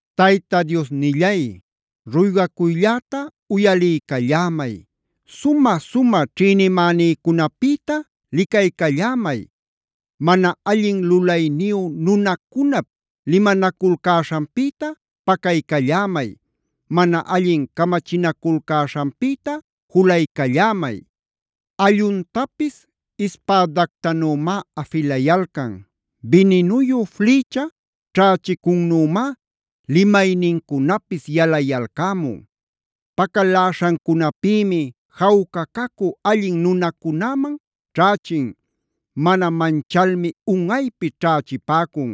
Tayta Diosnillay, ruygacuylläta uyaliycallämay. Sumä-sumä ćhïnimänïcunapïta licaycallämay. Mana allin lulayniyu nunacunap limanaculcäśhanpïta pacaycallämay. Mana allin camachinaculcäśhanpïta julaycallämay. Alluntapis ispädactanümá afilayalcan. Bininuyu flïcha ćhächicunnümá limaynincunapis yalayalcämun. Pacaläśhancunapïmi jawca cacü allin nunacunäman ćhächin. Mana manchalmi unꞌaypi ćhächipäcun.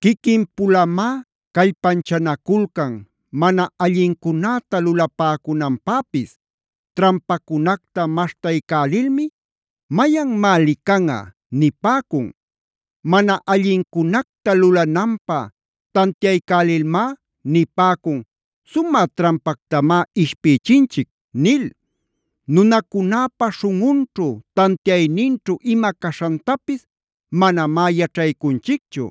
Quiquin-pulamá callpanchanaculcan mana allincunäta lulapäcunanpäpis. Trampacunacta maśhtaycälilmi: “Mayanmá licanꞌa” nipäcun. Mana allincunacta lulananpä tantiaycälilmá nipäcun: “Sumä trampactamá ishpïchinchic” nil. Nunacunäpä śhunꞌunćhu, tantiayninćhu ima caśhantapis manamá yaćhaycunchicchu.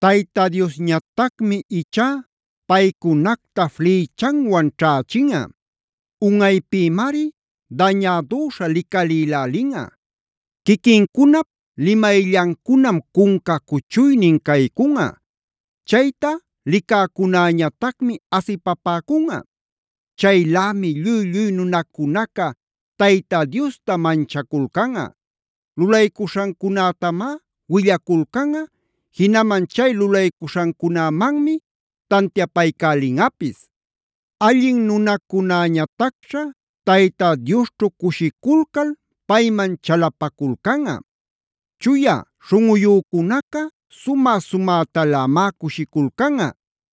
Tayta Diosñatacmi ichá paycunacta flïchanwan ćhächinꞌa. Unꞌaypïmari dañädüśha licalïlälinꞌa. Quiquincunap limayllancunam cunca cuchuynin caycunꞌa. Chayta licäcunäñatacmi asipapäcunꞌa. Chaylämi lluy-lluy nunacunaca Tayta Diosta manchaculcanꞌa. Lulaycuśhancunätamá willaculcanꞌa, jinaman chay lulaycuśhancunämanmi tantiapaycälinꞌapis. Allin nunacunäñatacćha Tayta Diosćhu cushiculcal payman chalapaculcanꞌa. Chuya śhunꞌuyücunaca sumä-sumätalämá cushiculcanꞌa.